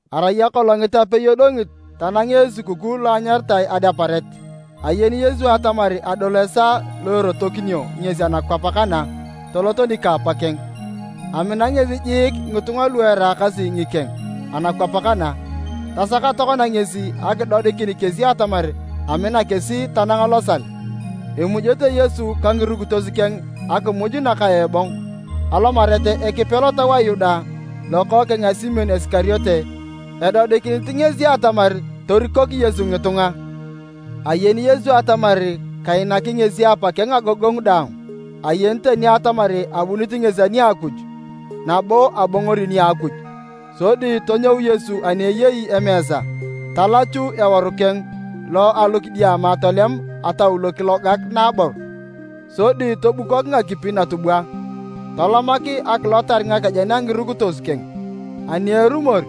Arai akolongit apei edongit tanangea esukukuu lo anyaritae Adeparet. Ayeni Yesu atamar adol esaa lo erotokinio ngesi anakwap kana tolot nika Apakeng. Amina ngesi jiik ngitunga lu eraakasi ngikeng anakwap kana, tasak tokona ngesi akidodikin kesi atamar amina kesi tanang losal. Emujete Yesu ka ngirukitos keng akimuj naka ebong. Alomarit Ekipe lotau a Yuda, lokookeng a Simon Isikariote, edodikinit ngesi atamar torikok Yesu ngitunga. Ayeni Yesu atamar kainaki ngesi Apakeng agogongu daang, ayeni tani atamar abunit ngesi ani a Akuj, nabo abongori nia Akuj. Sodi tonyou Yesu ani ayei emeesa, talachu eworu keng lo a alokidiama tolem ataulo kilogak naabor. Sodi tobukok ngakipi natubwa, tolomak akilotar ngakejen a ngirukitos keng, ani erumor,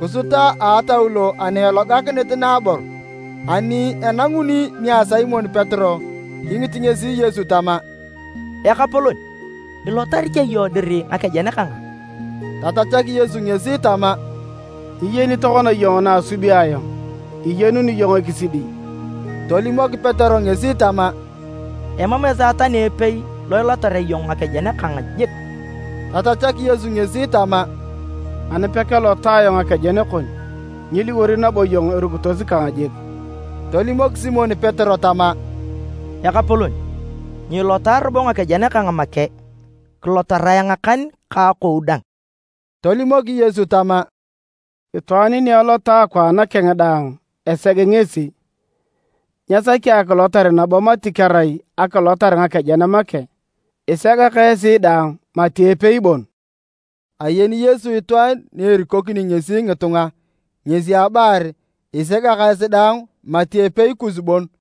kisuta a ataulo ana elogakinit naabor. Ani enanguni nia Simon Petero kingit ngesi Yesu tama, “Ekapolon, ilotari cha iyong dir ngakejen kang a?” Tatachak Yesu ngesi tama, “Nyiyeni tokona iyong na asubi ayong, iyenuni iyong ekisidi.” Tolimok Petero ngesi tama, “Emam esaa tani epei lo ilotarea iyong ngakejen kang jik!” Tatachak Yesu ngesi tama, “Ani pekelota ayong ngakejen kon, nyiliwor nabo iyong erukitos kang jik!” Tolimok Simon Petero tama, “Ekapolon, nyiilota robo ngakejen kang make, kilotarae ngakan ka akou dang!” Tolimok Yesu tama, “Itwaan ni elota akwaan keng daang eseg ngesi. Nyesaki akilotar nabo mati kerai akilotar ngakejen make. Isegak esi daang, isegak esi daang mati epei bon.” ( Ayeni Yesu itwaan ni erikokini ngesi ngitunga, ngesi abalar, “Isegak esi daang mati epei kus bon.”)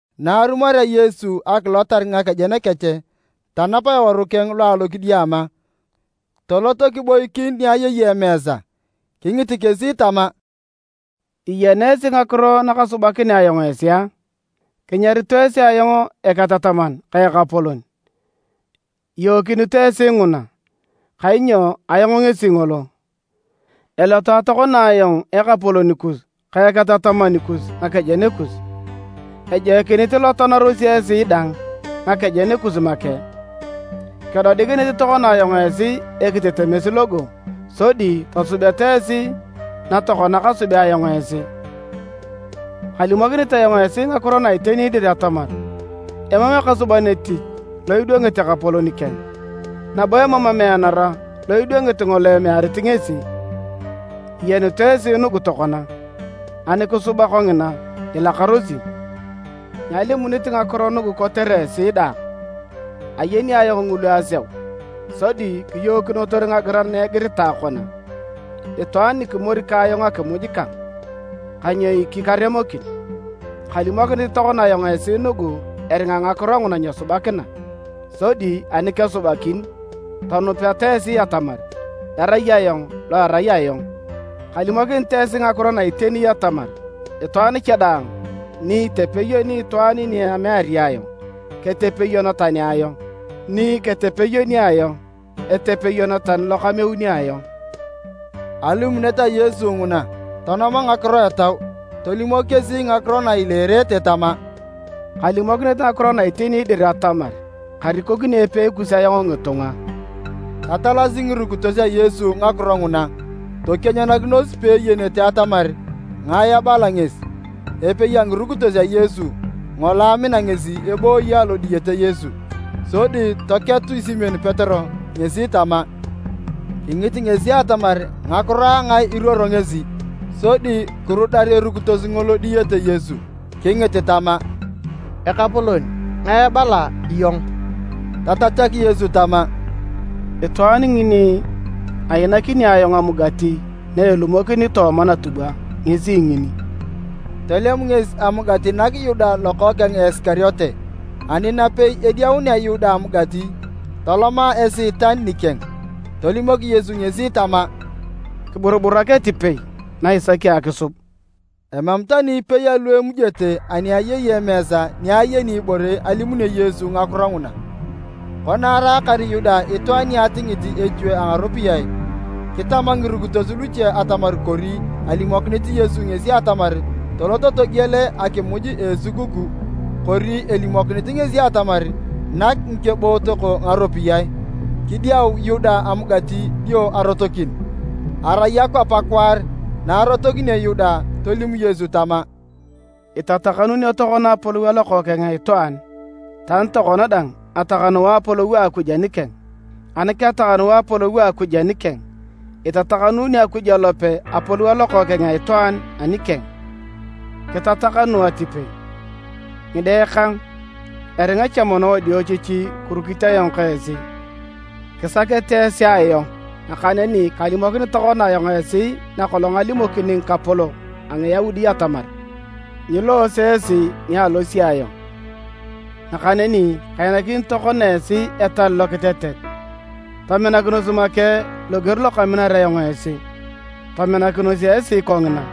Na arumorea Yesu akilotar ngakejen kech tanap eworu keng lo alokidiama tolot kiboikin ni ayei emeesa. Kingit kesi tama, “Iyena esi ngakiro nakasubea ayong esi a? Kinyarito esi ayong Eketataman ka Ekapolon, iyookinito esi nguna, kainyo ayong ngesi ngolo. Elota tokona ayong Ekapolon kus ka Eketataman kus ngakejen kus. Ejoikinit ilotanarosi esi dang ngakejen kus make. Kedodikinit tokona ayong esi ekitetemes logo sodi tosubeta esi na tokona kasubea ayong esi. Kalimokinit ayong esi ngakiro na iteni dir atamar, emam ekasuban etich lo idwangit ekapolon keng, nabo emam emeanara lo idwangit ngolo emearit ngesi. Iyenut esi nugu tokona, ani kisuba kongina, ilakarosi! “Nyalimunit ngakiro nugu kotere esi daang, ayeni ayong ngulu aseu, sodi kiyookinotor ngagiran na igiritae kona, ‘Itwaan nikimori ka ayong akimuj kang, kanyoiki karemokin.’ Kalimokinit tokona ayong esi nugu eringa ngakiro nguna nyesubakina, sodi ani kesubakin, tonupeta esi atamar, ‘Erai Ayong Lo erai Ayong.’ Kalimokinit esi ngakiro na iteni atamar, itwaan cha daang ni itepeyoni itwaan ni ameari ayong, ketepeyon tani ayong, ni ketepeyoni ayong, etepeyon tani lokameuni ayong.” Alimunet a Yesu nguna, tonoma ngakiro etau, tolimok kesi ngakiro na ileerete tama, “Kalimokinit ngakiro na iteni dir atamar, karikokini epei kus ayong ngitunga.” Tatalasi ngirukitos a Yesu ngakiro nguna tokianyanakinos peeyenete atamar ngae abala ngesi. Epei a ngirukitos a Yesu, ngolo amina ngesi, ebooyi alo diyete Yesu. Sodi toketu Simon Petero ngesi tama, “Kingit ngesi atamar ngakiro a ngae iruoro ngesi.” Sodi kirudar erukitos ngolo diyete Yesu kingit tama, “Ekapolon, ngae ibala iyong?” Tatachak Yesu tama, “Itwaan ngini ainakini ayong amugati na elumokini tooma natubwa ngesi ngini.” Tolem ngesi amugati nak Yuda lokookeng a Isikariote. Ani napei ediaunea Yuda amugati, toloma Esiitan nikeng. Tolimok Yesu ngesi tama, “Kiburuburak atipei na isaki akisub!” Emam tani ipei alu emujete ani ayei emeesa ni ayeni ibore alimunio Yesu ngakiro nguna. Kona araakar Yuda itwaan ni atingit echue a ngaropiyae, kitama ngirukitos luche atamar kori alimokinit Yesu ngesi atamar tolot togiel akimuj a esukukuu, kori elimokinit ngesi atamar, nak ngikebootok ngaropiyae. Kidiau Yuda amugati dio arotokin. Arai akwap akwaar. Na arotokinio Yuda, tolim Yesu tama, “Itatakanuunio tokona apolou a Lokookeng a Itwaan, tani tokona dang atakanuu apolou a Akuj anikeng. Ani ketakanuu apolou a Akuj anikeng, itatakanuuni Akuj alope apolou a Lokookeng a Itwaan anikeng, kitatakanu atipei. Ngide kang, eringa cha mono wadiochichi kirukit ayong ka esi. Kisakete esi ayong, nakaneni kalimokini tokona ayong esi nakolong alimokini ngikapolok a Ngiyaudi atamar, ‘Nyiloose esi ni alosi ayong.’ Nakaneni kainakini tokona esi etal lokitetet tominakinos make loger lokaminar ayong esi, tominakinos esi kongina.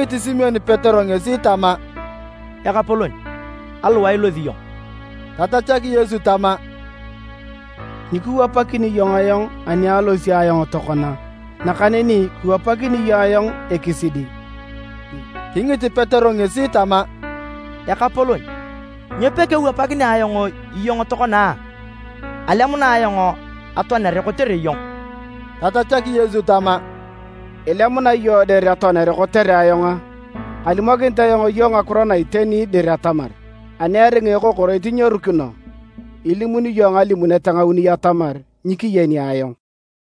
Kingit Simon Petero ngesi tama, “Ekapolon, aliwae ilosi iyong?” Tatachak Yesu tama, “Nyikiwapakini iyong ayong anialosi ayong tokona, nakaneni kiwapakini iyong ayong ekisidi.” Kingit Petero ngesi tama, “Ekapolon nyo pekewapakinea ayong iyong tokona a? Alemuna ayong atoanere kotere iyong!” Tatachak Yesu tama, “Ilemuna iyong dir atoanere kotere ayong a? Kalimokinit ayong iyong ngakiro na iteni dir atamar, ani eringa ekokoroit nyerukino, ilimuni iyong ngalimunet ngauni atamar nyikiyeni ayong.”